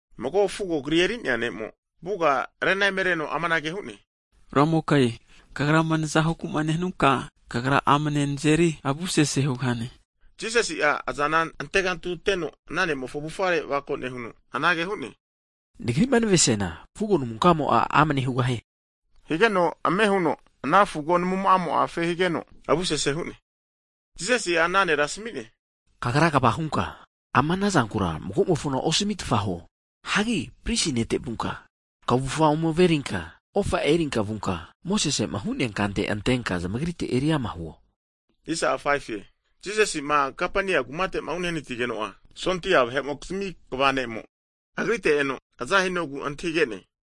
Mago fugo namure'nea ne'mo'a, avuga rena emereno amanage hu'ne, Ramoka Kagrama naza huku'ma nehanunka, Kagra amane nazeri avusese hugahane. Higeno Jisasi'a azana antegantuteno ana ne'mofo avufare avako nehuno, anage hu'ne, Nagrima navesiana, fugo namunka'amo'a amane hugahie. Higeno ame huno ana fugo namumo'a afe higeno, avusese hu'ne. Jisasi'a ana nera asami'ne, Kagra kva hunka, ama zankura mago'mofona osamitfa huo. Hagi pristi nete vunka, kavufa ome averinka ofa erinka vunka, Mosesema hu'nea kante antenka zamagrite eri ama huo. Jisasi'ma Kapeniumu kumate uhanatigeno'a, 100'a sondia vahe'mokizmi kva ne'mo (sensurien), Agrite eno aza hinogu antahige'ne.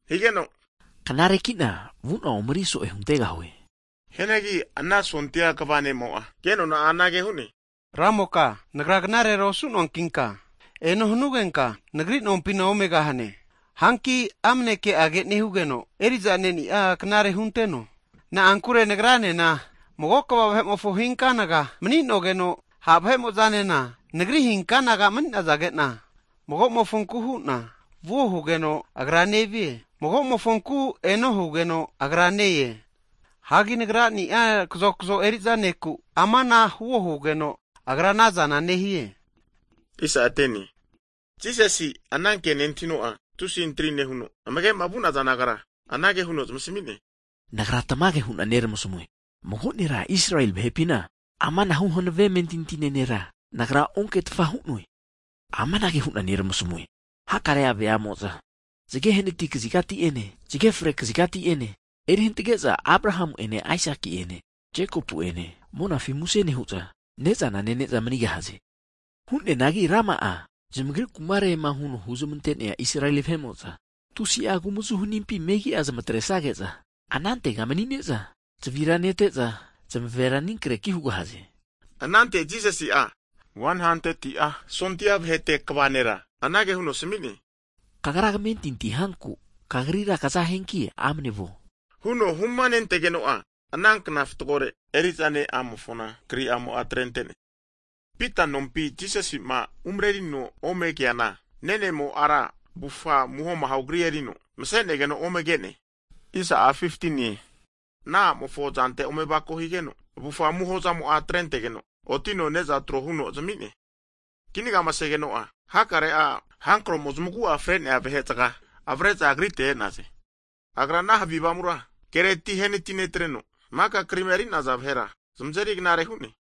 Higeno Knareki'na vu'na ome eri so'e huntegahue. Hianagi ana sondia kva ne'mo'a kenona'a anage hu'ne, Ramoka, nagra knarera osu'noankinka, eno hanugenka nagri nompina omegahane. Hanki amane ke'age nehugeno, eri'za ne'nia knare hunteno. Na'ankure nagranena mago kva vahe'mofo hinkanaga mani'nogeno, sondia vahe'mo'zanena nagri hinkanaga mani'nazage'na, mago'mofonku hu'na vuo hugeno, agra nevie. Mago'mofonku eno hugeno agra ne-e. Hagi nagrani'a kazokzo eri'za neku, amana huo hugeno, agra anazana nehie. Hagi Jisasi'a ana ke nentahino'a, tusi antri nehuno, amage'ma vu'naza nagara anage huno zamasmi'ne, Nagra tamage huna neramasamue, mago nera Israeli vahepina amanahu hanave amentintine nera, Nagra onketfa hu'noe. Amanage hu'na neramasamue, hakare'a veamo'za zage nehanatia kazigati'ene zage fre kazigati'ene eri hantage'za Abraha'ene Aisaki'ene Jekopu'ene monafina muse nehu'za, ne'za nene'za manigahaze. Hu'neanagi rama'a zamagri kumarema huno'ma huzmante'nea Israeli vahe'mo'za tusi'a kumazu hanimpi megi'a zamatresage'za, anantega manine'za zavira nete'za, zamavera aninkreki hugahaze. Anante Jisasi'a 100'a sondia vahete kva nera anage huno asami'ne, Kagrama kamentinti hanku kagrira kaza hugahianki amne vuo, huno humanentegeno'a, ana kna fatgore eri'za ne'amofona kri'amo'a atrente'ne. Pita nompi Jisasi'ma umarerino ome keana, nenemo ara avufa amuho amaho kri erino mase'negeno omege'ne. Ana huteno ana a'mofo azante ome avako higeno, avufa amuho zamo'a atrentegeno, otino neza tro huno zami'ne. Kinagama segeno'a, hakare havi avamutami zamagu'a fre'nea vahe zaga zamare'za Agrite e'naze. Agra ana havi avamura kereti ahenati netreno, maka krima eri'naza vahera zamazeri knamare'ne.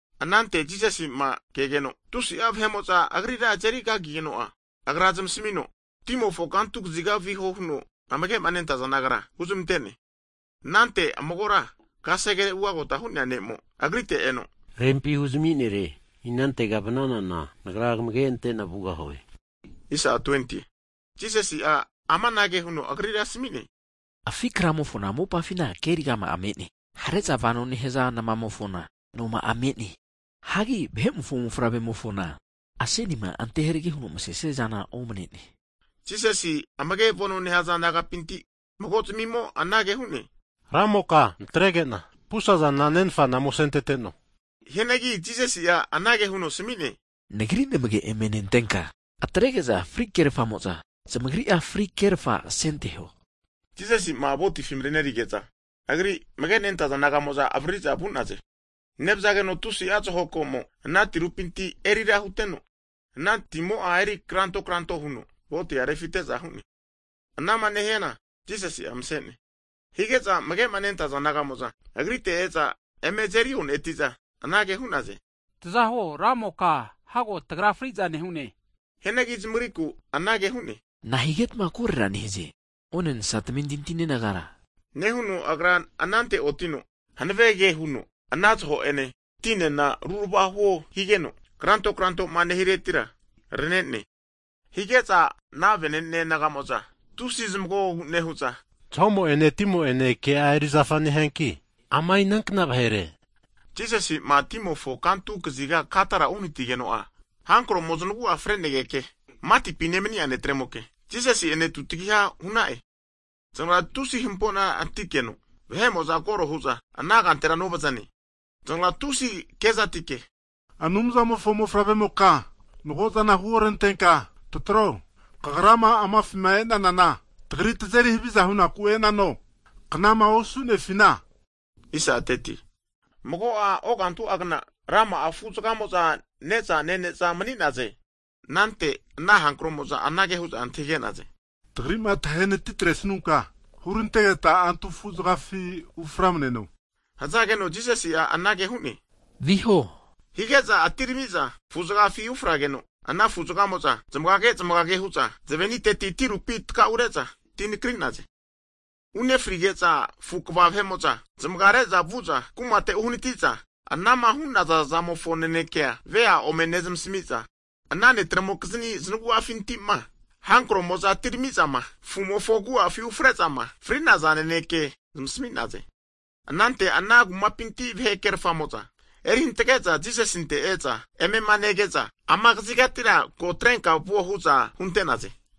Anante Jisasi'ma kegeno tusi'a vahe'mo'za Agrira azeri kagigeno'a, Agra zamasmino timofo kantu kaziga viho huno amage'ma nentaza disaipoli nagara huzmante'ne. Anante magora kasegere ugagota hu'nea ne'mo Agrite eno amanage hu'ne, Rempi hurami nere, inantego vnanana, nagra kamage ante'na vugahue. Higeno Jisasi'a amanage huno agrira asami'ne, Afi kramofona mopafi nemasea kerigama'a me'ne. Hare'za vanoma nehaza namaramimofona nozamia me'ne. Hianagi Vahe'mofo Mofavre'mofona asenima anteharege huno masesia zana omane'ne. Jisasi amagema nentaza disaipol nagapinti mago zamimo anage hu'ne, Ramoka natrege'na pusazana nenfana ome asenteteno huno hu'ne. Hianagi Jisasi'a anage huno asami'ne, Nagri namage eme nentenka, atrege'za fri kerfamo'za, zamagri'a fri kerfa asenteho. Jisasi'ma votifima marenerige'za, Agri amage'ma nentaza disaipol naga'mo'za avaririza vu'naze. Nevazageno tusi'a zaho komo ana tirupinti agafa huteno, ana timo'a eri kranto kranto huno votia refite'za hu'ne. Jisasi'a masenegeno anara hu'ne. Hige'za amagema nentaza disaipoli naga'mo'za, Agrite eza eme azeri oneti'za anage hu'naze, taza huo Ramoka, Hago tagra friza nehune. Hianagi zamagrikura anage hu'ne, Nahigetma korera nehaze, onensa tamentintine nagara? Nehuno Agra anante otino hanave ke huno ana zaho ene, tinena rurava huo higeno, kranto krantoma nehiretira, arane'ne. Hige'za ana disaipol naga'mo'za tusi zamagogogu nehu'za, zahomo'ene, timo'ene ke'a erizafa nehianki, ama inankna vahere? hu'naze. Jisasi'ma timofo kantu kaziga Gadara uhanatigeno'a, hankaro'mo znagu'a fre'negeke matipi nemani'a netremoke, Jisasi'ene tutagiha hu'na'e. Zanagra tusi hamponatikeno vahe'mo'za koro hu'za ana kantera novazane. Zanagra tusi kezatike, Anumzamofo Mofavre'moka, nago'azana huorantenka tataro. Kagrama amafima e'nanana tagri tazeri haviza hunaku e'nano, knama osu'nefina? Hagi mago'a ogantu'agna rama'a afu zagamo'za ne'za nene'za mani'naze. Anante ana hankaromo'za anage hu'za antahige'naze, Tagri'ma tahe natitresunka, hurantegeta antu afu'zagafi uframneno. Hazageno Jisasi'a anage hu'ne, Viho! Hige'za atiramiza afu'zagafi ufrageno, ana afu'zagamo'za zamagage zamagage hu'za zaveniteti tirupi tkaure'za ti nakri'naze. Unefrizage'za afu' kva vahe'mo'za zamaga re'za vu'za kumate uhanati'za, anama hu'naza zamofo naneke vea' ome nezamasami'za ana netremokizni zanagu'afinti'ma hankro'mo'za atirami'zama afu'mofo agu'afi ufre'zama fri'naza naneke zamasmi'naze. Anante ana kumapinti vahe krerfamo'za eri hantge'za Jisasinte e'za, emema nege'za, Ama tagri kazigatira ko atrenka vuo, hu'za hunte'naze.